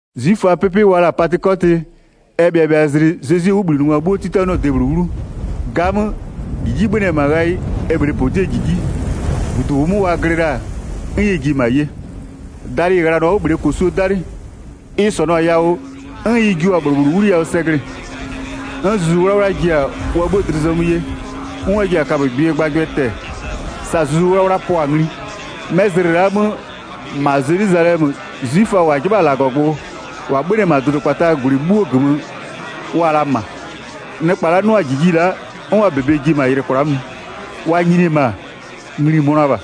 'Zwiföaa 'pɩpɩ wa la-a Patɩkɔtɩ, ɛ bhɩabhɩazlɩ Zezwie 'wʋbhlinɩngwa 'bhuo 'titanɩɔ-ɔ debhlʋ 'wlu. 'Gamö, -jiji 'bhönɩ-ɛ -ma ghayɩ, ɛ -bhlee -podiee -jiji, -budu -ʋʋ 'mö wa glɩ la-a, 'n ɛ ji-e -ma ye. Dalɩ -ɩ ghlanʋa-a 'wʋ -bhlee -kosuo 'dalɩ. Ɩ -sɔnʋ-a yawʋ, 'n ɩ jua-a -bhlʋ -bhlʋ 'wliyawʋ sɛ glɩ-ɩ. 'N Zuzu 'Wlawla ji-a wa 'bhuo dlɩ zɔmö ye, 'n wa ji-a kabögbɩɛ gbagbʋ tɛ-ɛ, sa Zuzu 'Wlawla pʋa-a ngli. 'Mɛ zlɩ la'a 'mö -ma Zelwizalɛmö, 'zwiföa -wa 'jɩbha-a -Lagɔgbʋ, -wa 'bhönɩ-ɛ -ma dʋdʋkpataa -gwlɩ 'bhuoo -gömö, wa-a la -ma. Nɩkpa la'a 'nʋ-a -jiji la'a, 'n wa -bebe ji-e -ma yɩlɩ kwla'a mö. Wa nyini-e -ma, ngli-i mönʋa -bha.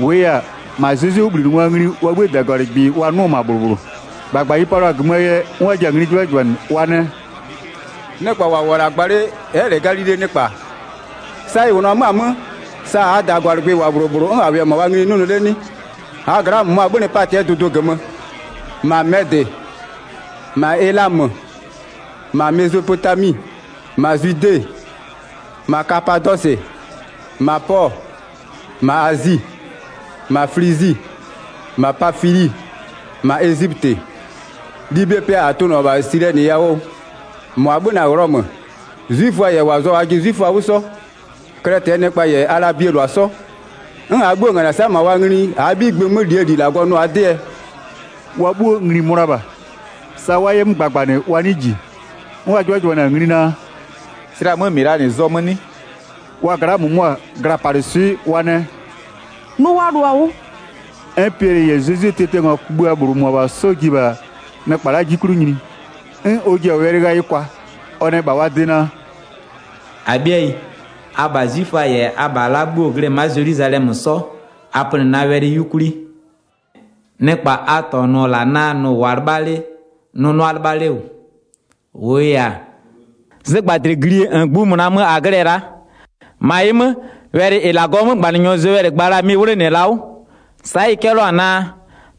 -Wʋʋ yɛ-a, -ma Zezwie 'wʋbhlinɩngwaa ngli wa 'bhïë -dagwalɩgbɩ wa 'nʋ-ɔ -ma -bhlʋ -bhlʋ. 7-Gbagba ɩ palʋa-a -gömöö yɛ 'n wa ji-a ngli 'jɩbhajɩbhanɩ, wa nɛ: “Nɩkpa -wa -wʋ-ɔ -la gba 'le 'nɩ-ɛ bhe Galilee nɩkpa? Sa ɩ -wʋnʋ-ɔ 'mö-a 'mö, sa -aa -dagwalɩgbɩ -wʋ-a -bhlʋ -bhlʋ 'n -a -wɩɩ-ɛ -ma wa ngli 'nʋnʋ 'le 'nɩ? 9-Aa gla'aa -mʋmʋa 'bhönɩ Patɩɛ dʋdʋ -gömö, -ma Mɛdɩ, -ma Elamö, -ma Mezopotami, -ma Zwide, -ma Kapadɔsɩ, -ma Pɔɔ, -ma Azi. 10-Ma Flizi, -ma Pafili, -ma Ezipötɩ. Libie pɩa -a tʋnʋ-ɔ -ma Silɛnɩ yawʋ, -mʋa 'bhönɩ Ghlɔmö, 'zwiföa -yɛ -wa zʋa-a wajɩ 'zwiföa 'wʋ 'sɔ, Klɛtɩɛ nɩkpa -yɛ Alabie -lʋa 'sɔ, 'n -aa 'bhuo -nganɩ-ɛ -sa -ma wa ngli -aa 'bhigbɩ 'mö -lie -li -Lagɔ nʋ-aa 'dɩɛ?” Wa 'bhuo ngli-i mönʋa -bha. Sa wa 'yɛ 'mö gbagbanɩ wa 'nɩɩ -ji. 'N wa 'jɩbhajɩbhanɩ-a ngli naa: “Slɛ-a 'mö -mɩ -laa -nɩ zɔmö 'nɩ?” Wa gla'aa -mʋmʋa, glapalɩswɩ'ɩ wa nɛ: “Nʋ wa lʋ-a 'wʋ.” 'N Piɛlɩ -yɛ Zezwie tiatiangwa kugbïa -bhlʋ -mʋabha 'sɔ ji-e -bha nɩkpa la'aa 'ji 'klʋ nyini. 'N ɔ ji-a wɛlɩ ghayɩ kwa, ɔ nɛ -bha wa de naa: “-Abhɩayi, abha 'zwiföa -yɛ abha la'a bhuo-o glɩ-ɛ ma'a Zelwizalɛmö 'sɔ, a pönɩ na wɛlɩ 'yukwli. Nɩkpa a -tɔnʋ-ɔ -la naa nʋ-ʋ -wʋʋa 'lɩbha 'le, nʋ 'nʋa 'lɩbha 'le -wʋ, -wʋʋ yɛ-a, zɩgbadlɩglie -ngbïmʋna mö -a glɩ-ɛ la'a. 16-Ma ɩ 'mö, wɛlɩ -ɩ -Lagɔɔ 'mögbanɩnyɔ Zowɛlɩ gba la-a mɩ-ɩ 'wlenɩ-ɛ la'a 'wʋ. Sa'a ɩ 'cɛlɩɔ-a naa: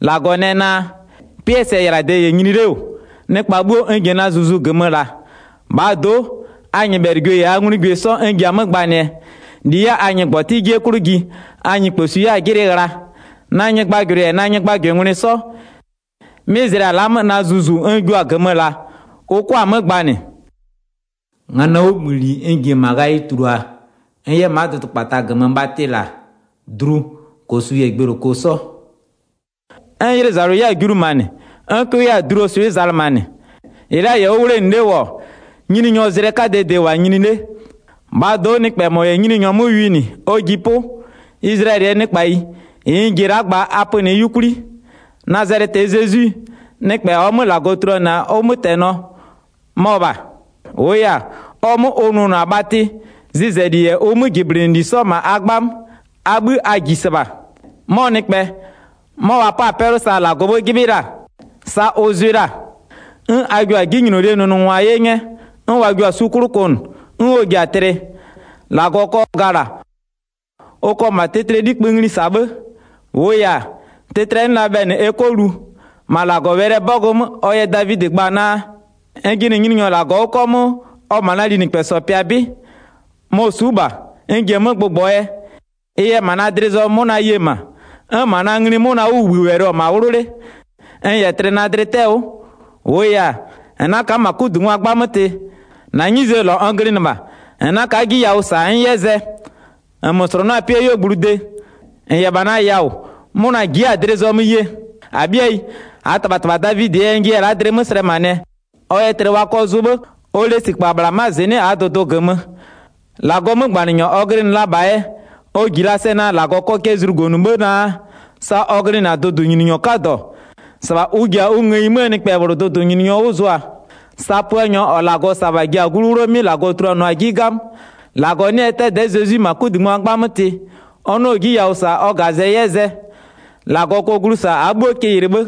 -Lagɔ nɛ naa: 'Pɩɛ sɛyɩlade -yɛ nyini 'le -wʋ-ɔ, nɩkpa 'bhuo n ji-a na Zuzu -gömö -laa. -Bhaa do'o, a nyɩbhɛlɩgwie -yɛ a nglugwie 'sɔ n ji-a 'mö gbanɩɛ, -li 'yɛ-a a ngɩgbɔtɩ 'jie 'klʋ ji, a nyɩkposwi 'yɛ-a 'jɩlɩ ghla. Na nyɩgbajʋlʋɩ -yɛ na nyɩgbajʋlʋngwlɩ 'sɔ, 'mɩ zlɩa la'a 'mö na Zuzu n jua-a -gömö -laa, ʋ 'kʋa-a 'mö gbanɩ. Nganɔɔ 'wʋbhïli n ji-e -ma ghayɩ tulua n 'yɛ-a ma'a dʋdʋkpata -gömö bhatɩ -la, dlu, -kosu -yɛ gbeyloko 'sɔ. 'N 'ylʋzalʋ 'yɛ-a julumanɩ, 'n 'cʋ 'yɛ-a dluo swɩ'ɩ zalɩmanɩ. -Ɩ la'a -yɛ 'wʋ 'wlenɩ 'le -wʋ-ɔ, Nyininyɔɔ zlɩ 'kadɛɛ de -wʋ-a nyini 'le. 21-Bhaa do'o nɩkpɛ -mɔ -yɛ Nyininyɔ 'mö winɩ ɔ ji 'pʋ. Izlayɛlɩɛ nɩkpayi, -ɩ n ji-e la'a gba, a pönɩɩ 'yukwli. Nazalɛtɩɛ Zezwi, nɩkpɛ -ɔɔ 'mö -Lagɔ tuluanɩ-a ʋ 'mötɛnɔ, mɔ -bha. -Wʋʋ yɛ-a, ɔ 'mö ʋ nʋnʋ-a bhatɩ, zɩzɛli -yɛ ʋ 'möjɩblɩnɩli 'sɔ -ma a 'gbamö, a 'bhï a -ji -sɩbha. 'Mɔ nɩkpɛ, 'mɔ -wa 'pa-a 'pɛlʋ sa -Lagɔɔ 'bhë 'jɩbhɩ la-a, sa ʋ zʋɩ la-a. 'N a jio-a 'jinylolie nʋngwa 'ye 'nyɛ, 'n wa jio-a su 'klʋ kʋnʋ 'n ɔ ji-a tlɩ. 24-Lagɔ kɔ gala, ʋ kɔ -ma tlɩtlɩɛ 'likpï ngli -sa 'bhë. -Wʋʋ yɛ-a, tlɩtlɩɛ 'nɩ la bhɛlɩ ɛ 'kɔ lu. 25-Ma -Lagɔwɛlɩɛ 'bɔgʋ 'mö, ɔ yɛ Davidɩ gba-a naa: N jɩnɩ Nyininyɔ -Lagɔ 'wʋ 'kɔmʋʋ, ɔ-ɔ -bha na linɩkpɛsɔ pɩa 'bɩ. Mɔ-ɔ su'u -bha, n ji-e 'mö gbʋgbɔɔ yɛ. Ɩ yɛ -ma na dlɩ zɔmö 'mʋna ye-e -ma, 'n -ma na ngli 'mʋnaa 'wʋbhïwɛlɩ -wʋ-ɔ -ma 'wlʋ 'le. N -yɛ tlɩ na dlɩ 'tɛ-ɛ 'wʋ. 27-Wʋʋ yɛ-a, -n 'na ka'a -ma 'kudungwa 'gbamö tɩ. -Na 'nyizee -lɔ n glɩnɩ -bha, -n 'na ka'a 'ji yawʋ -sa n 'yɛ zɛ. 28-Nmö -slʋnʋ'ʋ-a 'pɩɛ 'yuogblʋ de, -n -yɛ -bha na yawʋ -wʋ, 'mʋna ji'i-a dlɩ zɔmö yee. 29-Abhɩayi, -aa -tɩbhatɩbha Davidɩɛ yɛ n jiya-a la'a dlɩ 'mö slɛmanɩɛ. Ɔ yɛ tlɩ wa kɔ zʋ 'bhë. Ɔ lesikpa -bhla ma'a -zɩnɩ'ɩ -aa dʋdʋ -gömö. 30-Lagɔɔ 'mögbanɩnyɔ ɔ glɩnɩ la -bhaa yɛ, ɔ -ji la-a sɛ naa -Lagɔ kɔ cɛ zlugonʋ 'bhë naa, sa ɔ glɩnɩ-a dʋdʋnyininyɔ 'kadɔ, -sɩbha ʋ ji-a ɔ ngëyi 'möö nɩkpɛ -bhlʋ dʋdʋnyininyɔ 'wʋ zʋa. 31Sa Puanyɔ -ɔ -Lagɔ -sa-a -bha ji-a glu 'wlʋɔ 'mɩ -Lagɔ tuluanɩɔ-a 'ji 'gamö. -Lagɔ 'nɩ-ɛ 'dɛdɛ'ɛ Zezwi -ma 'kudungwa 'gbamö tɩ, ʋ 'nɩɔ-ɔ 'ji yawʋ -sa ɔ -gazɛ 'yɛ zɛ. 32-Lagɔ kɔ glu -sa -aa 'bhuo kɩ yɩlɩ 'bhë.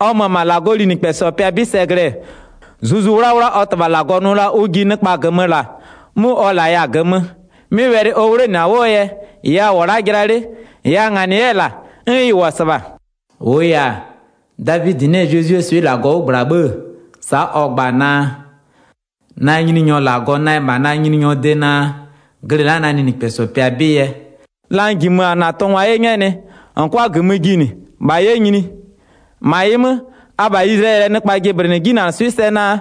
33Ɔ mö-ö -ma -Lagɔɔ linɩkpɛsɔ pɩa 'bɩ sɛ -glɩɛ, Zuzu 'Wlawla ɔ -Tɩbha -Lagɔ nʋ la-a ʋ ji nɩkpa -gömö -laa, 'mʋ ɔ -laya-a -gömö. 'Mɩ wɛlɩ ɔ 'wlenɩ-a 'wʋɔ yɛ, -ɩ a -wʋ-ɔ la'a jɩla 'le, -ɩ a -nganɩ 'yɛ-ɛ -la, 'n ɩ -wʋ-ɔ -sɩbha. 34-Wʋʋ yɛ-a, Davidɩ 'nɩ-ɛ Zezwie swɩ'ɩ -Lagɔ 'wʋ -gbla 'bhë-ë, sa'a ɔ gba-a naa: Na Nyininyɔ -Lagɔ nɛ -bha na nyininyɔɔ de naa, glɩ la'a na linɩkpɛsɔ pɩa 'bɩ yɛ, 35la n -jimö-a -na tʋngwa 'ye 'nyɛnɩɛ, -n 'kʋa -gömö jinɩ, -bha 'yɛ nyini. 36-Ma ɩ 'mö, abha Izlayɛlɩɛ nɩkpa jɩblɩnɩ 'jinanɩswɩ'ɩ sɛ naa,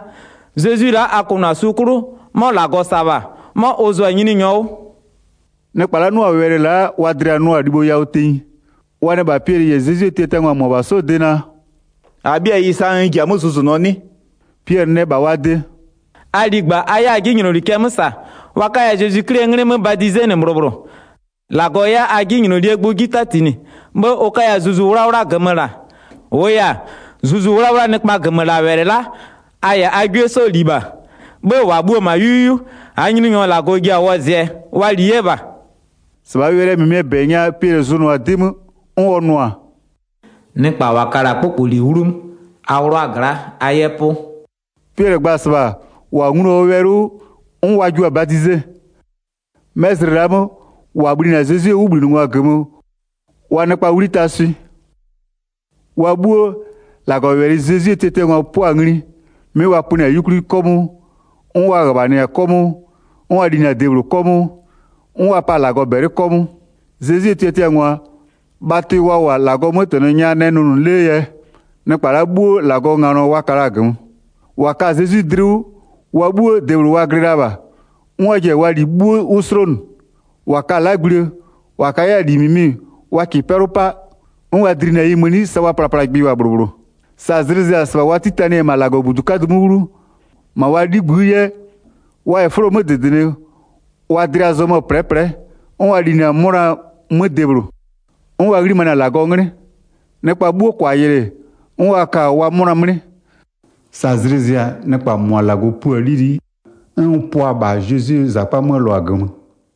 Zezwi la'a a kʋnʋ-a su 'klʋ, 'mɔ -Lagɔ -sa-a -bha, 'mɔ ʋ zʋa-a Nyininyɔ 'wʋ.” Taka -nɩkpa -wa nglu-a Zezwie wɛlɩ 'wʋ 37Nɩkpa la'a 'nʋ-a wɛlɩ la'a wa dlɩa-a nʋʋa-a libho yawʋ tenyi, wa nɛ -bha Piɛlɩ -yɛ Zezwie tiatiangwa -mʋabha 'sɔɔ de naa: “-Abhɩayi, sa -a ji-a 'mö zʋzʋnʋɔ 'nɩ?” 38Piɛlɩ nɛ -bha wa de: “A ligba a 'yɛ a 'jinyloli cɛ 'mö -sa, wa 'kaya Zezwi 'Klie 'nglɩ 'mö badizenɩ -bhlʋ -bhlʋ, -Lagɔ 'yɛ a 'jinylolie gbʋ 'ji 'tatinɩ, 'bhë ʋ 'kaya Zuzu 'Wlawla -gömö -la. 39-Wʋʋ yɛ-a, Zuzu 'Wlawlaa nɩkpaa -gömölawɛlɩ la'a, a -yɛ a 'gwie 'sɔɔ -li -bha, 'bhë -wa bhuo-o -wʋ-ɔ -ma 'yu 'yu, -aa Nyininyɔ -Lagɔ ji-a wɔzɩɛ, wa li 'yɛ -bha.” 40-Sɩbhaa wɛlɩ -mɩmɩɛ -bɛ nya Piɛlɩ zʋnʋa-a 'dɩ 'mö, 'n ɔ nʋ-a: “Nɩkpa -wa ka-a -la 'kpʋkpʋli 'wlumö, a 'wlʋʋa gla'a a 'yɛ 'pʋ.” 41Piɛlɩ gba-a -sɩbha, -wa nglu-a ɔ wɛlɩ 'wʋ, 'n wa jua-a badize. 'Mɛ zlɩ la'a 'mö, -wa bhlinɩ-a Zezwie 'wʋbhlinɩngwa -gömö, wa nɩkpaa 'wli taa swɩ. Taka -Lagɔzakpaa 'pɩ 42Wa 'bhuo, -Lagɔwɛlɩ Zezwie tiatiangwa pʋa-a ngli, 'mɩ wa pönɩ-a 'yukwli 'kɔmʋʋ, 'n wa -ghöbhanɩ-a 'kɔmʋʋ, 'n wa linɩ-a debhlʋ 'kɔmʋʋ, 'n wa pa-a -Lagɔ -bɛlɩ 'kɔmʋʋ. 43Zezwie tiatiangwa, bhatɩ wa -wʋ-a -Lagɔɔ 'mötɛnɔ nya nɛ nʋnʋ 'lee yɛ, nɩkpa la'a 'bhuo -Lagɔɔ nganɔ wa ka la-a -gömö. 44-Wa ka-a Zezwi dlɩ 'wʋ, wa 'bhuo debhlʋ wa glɩ la -bha, 'n wa ji-a wa -li 'bhuo 'wʋ 'slonʋ. 45-Wa ka-a 'lagblie, -wa ka 'yɛ-a -li -mɩmɩ wa -kɩɩ 'pɛlʋ 'pa, 'n wa dlinɩ-a ɩ mëni sa wa plaplagbɩ -wʋ-a -bhlʋ -bhlʋ. 46Sa zlɩ zɩ-a, -sɩbha wa 'titanɩ-ɛ -ma -Lagɔbudu 'kadʋ 'mö 'wlu, -ma wa 'ligbï'ï 'yɛ, wa -yɛ 'fʋlo 'mö -dɩdɩnɩ, wa dlɩa zɔmö-ö -plɛɛplɛ'ɛ, 'n wa linɩ-a 'mʋna 'mö debhlʋ. 47'N wa 'ghlimanɩ-a -Lagɔɔ 'nglɩ. Nɩkpa 'bhuo -kʋa yɩlɩ, 'n wa ka-a wa 'mʋna 'mlɩ. Sa zlɩ zɩ-a, nɩkpa -mʋa -Lagɔ pua-a 'lili'i, 'n ʋ pʋa-a -bha Zezwie -zakpa 'möö -lʋa -gömö.